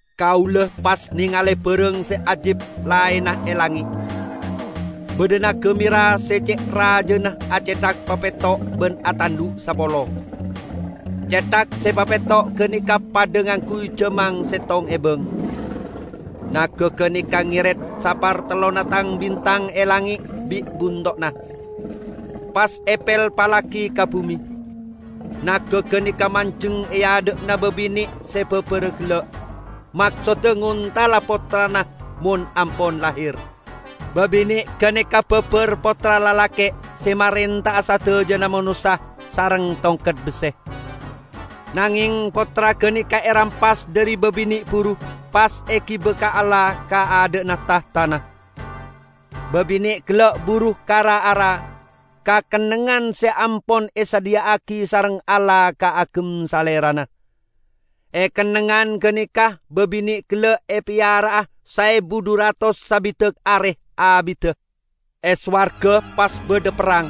Kaula pas nengale barang se ajib laenna e langnge'. Badha naga mera se ce' rajana acethak papetto' ban atandhu' sapolo. Cethak se papetto' ganeka padha ngangguy jamang settong ebang. Naga ganeka ngeret sapartellonna tang-bintang e langnge' bi' bunto'na, pas epelpallagi ka bume. Naga ganeka manjeng e adha'na babine' se babara gella', maksodda ngontala pottrana mon ampon lahir. Babine' ganeka babar pottra lalake' se marenta'a sadajana manossa sareng tongket besse. Nangeng pottra ganeka erampas dhari babine' buru, pas egiba ka Allah ka adha'na tahtana. Babine' gella' buru ka ra-ara, ka kennengngan se ampon esadhiya'agi sareng Allah kaagem salerana. E kennengngan ganeka babine' gella' epeyara'a saebu dhu ratos sabidak are abidda. E sowarga pas badha perrang.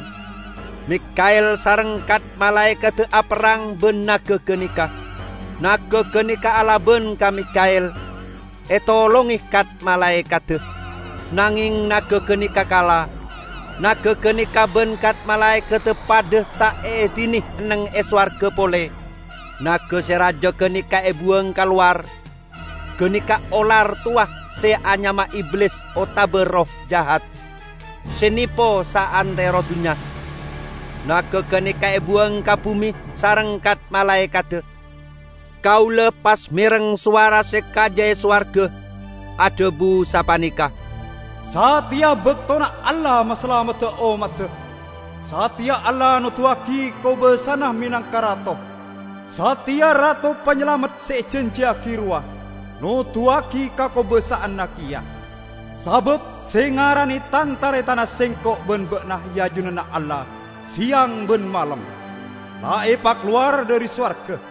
Mikha'el sareng kat-malaekadda aperrang ban naga ganeka. Naga ganeka alaban ka Mikha'el, etolonge kat-malaekadda. Nangeng naga ganeka kala. Naga ganeka ban kat-malaekadda padha ta' eedine enneng e sowarga pole. Naga se raja ganeka ebuwang kalowar. Ganeka olar towa se anyama Iblis otaba Erroh Jahat, se nepo saantero dunnya. Naga ganeka ebuwang ka bume sareng kat-malaekadda. Kaula pas mereng sowara se kaja e sowarga, adhabu sapaneka, "Sateya baktona Allah masalamedda ommadda! Sateya Allah noduwagi kobasana menangka Rato! Sateya Rato Panyalamet se ejanjiyagi rowa noduwagi kakobasa'anna keya! Sabab se ngarane tan-taretanna sengko' ban ba'na e ajunanna Allah seyang ban malem, la epakalowar dhari sowarga;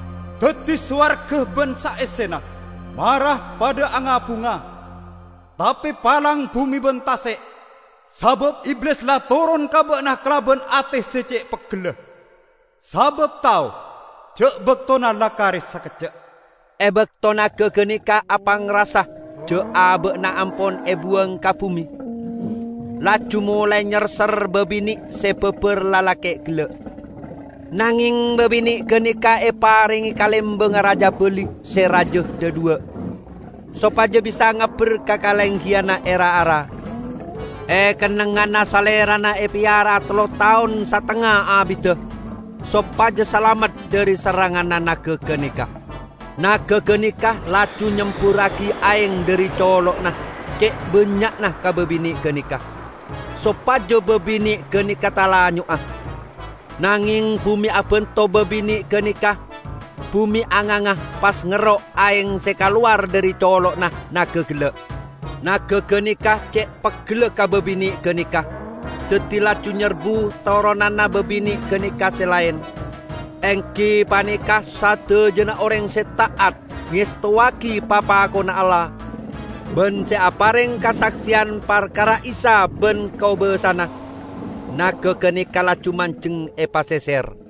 Daddi, sowarga ban saessena, mara padha anga-bunga! Tape palang bume ban tase', sabab Iblis la toron ka ba'na kalaban ate se ce' peggella, sabab tao ja' baktona la kare sakejja'." E bakto naga ganeka apangrasa ja' aba'na ampon ebuwang ka bume, laju molae nyerser babine se babar lalake' gella'. Nangeng babine' ganeka eparenge kalembangnga rajabali se raja dhadhuwa', sopaja bisa ngabber ka kalenggiyanna e ra-ara, e kennengnganna salerana epeyara'a tello taon satengnga abidda, sopaja salamet dhari serranganna naga ganeka. Naga ganeka laju nyemburragi aeng dhari colo'na ce' bannya'na ka babine' ganeka, sopaja babine' ganeka talanyo'a. Nangeng bume abanto babine' ganeka; bume anganga pas ngero' aeng se kalowar dhari colo'na naga gella'. Naga ganeka ce' peggella ka babine' ganeka, daddi laju nyerbu toronanna babine' ganeka se laen, enggi paneka sadajana oreng se ta'at ngestowagi papakonna Allah, ban se apareng kasakseyan parkara Isa ban kobasana. Naga ganeka laju manjeng e paseser.